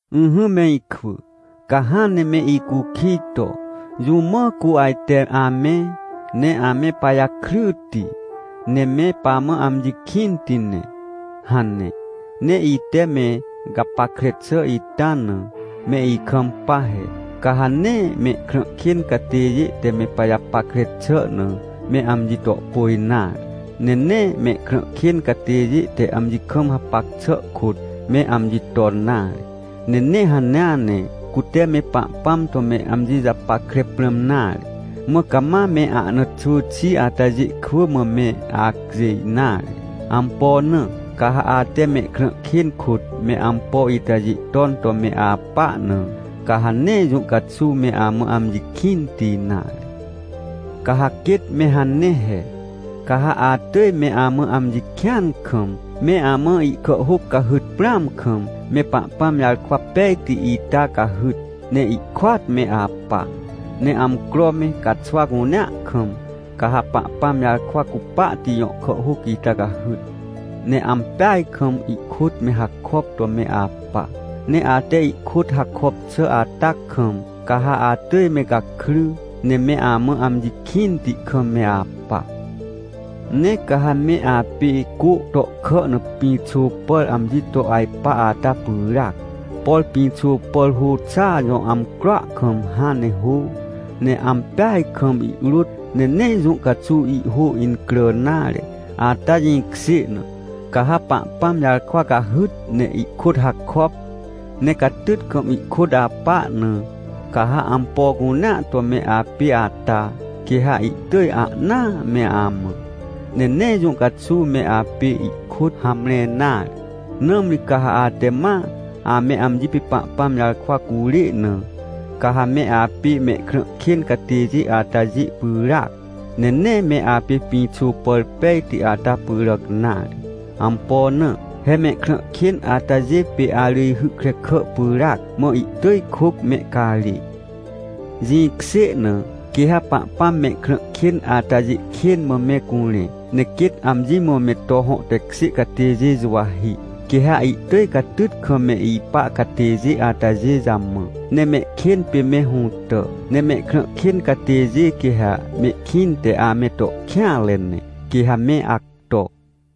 Ỹhỹ me ikwỳ, ca hãn ne me icukij to: “Jũ mã cu ajte ame, ne ame pajakryti, ne me pamã amji kĩnti ne?” hane. Ne ite me gapackre xà ita na, me ikampa he: Ca ha nee mehkrã kên catêjê te me pajapackre xà na, me amji to pôj nare. Ne nee mehkrã kên catêjê te amji kam hapac xà kôt, me amji ton nare. Ne nee hanea ne, cute me Pahpãm to me amji japackre prãm nare, mã cama me ahna xwỳ xi atajê kwỳ mã me acjêj nare. Ampo na? Ca ha ate me krã kên kôt me ampo itajê ton to me apa na, ca ha nee jũ caxuw me amã amji kĩnti nare. Ca ha quêt me hane he: Ca ha atỳj me amã amji kĩan kam, me amã ihkàhhôc cahyt prãam kam, me Pahpãm jarkwa pejti ita cahyt, ne ihkôat me apa. Ne amcro me caxwa cunea kam, ca ha Pahpãm jarkwa cupahti jõ kàhhôc ita cahyt, ne ampeaj kam ihkôt me hakop to me apa. Ne ate ihkôt hakop xà ata kam, ca ha atỳj me gakry, ne me amã amji kĩnti kam me apa. Ne ca ha me apê cô tohkà na pĩxô pàr amji to ajpa ata pyràac. Por pĩxô pàr hô xà jõ amcroa kam hãn ne hô, ne ampeaj kam ihrôt, ne nee jũ caxuw ihhô incrà nare. Ata jĩkjê na, ca ha Pahpãm jarkwa cahyt ne ihkôt hakop, ne catyt kam ihkôt apa na, ca ha ampo cunea to me apê ata, quê ha ihtỳj ahnaa me amã, ne nee jũ caxuw me apê ihkôt hamre nare. Nãmri ca ha ate ma ame amji pê Pahpãm jarkwa curê na, ca ha me apê mehkrã kên catêjê atajê pyràac, ne nee me apê pĩxô pàr pejti ata pyràc nare. Ampo na? He mehkrã kên atajê pê arỳjhy krekà pyràac, mã ihtỳj kôc mehcarê. Jĩkjê na, quê ha Pahpãm mehkrã kên atajê kên mã me curẽ, ne quêt amji mã me to hõ tekjê catêjê juwahi. Quê ha ihtỳj catyt kam me ipa catêjê atajê jamã, ne mehkên pê me hũtà. Ne mehkrã kên catêjê, quê ha mehkĩnte ame to kêanre ne, quê ha me acto.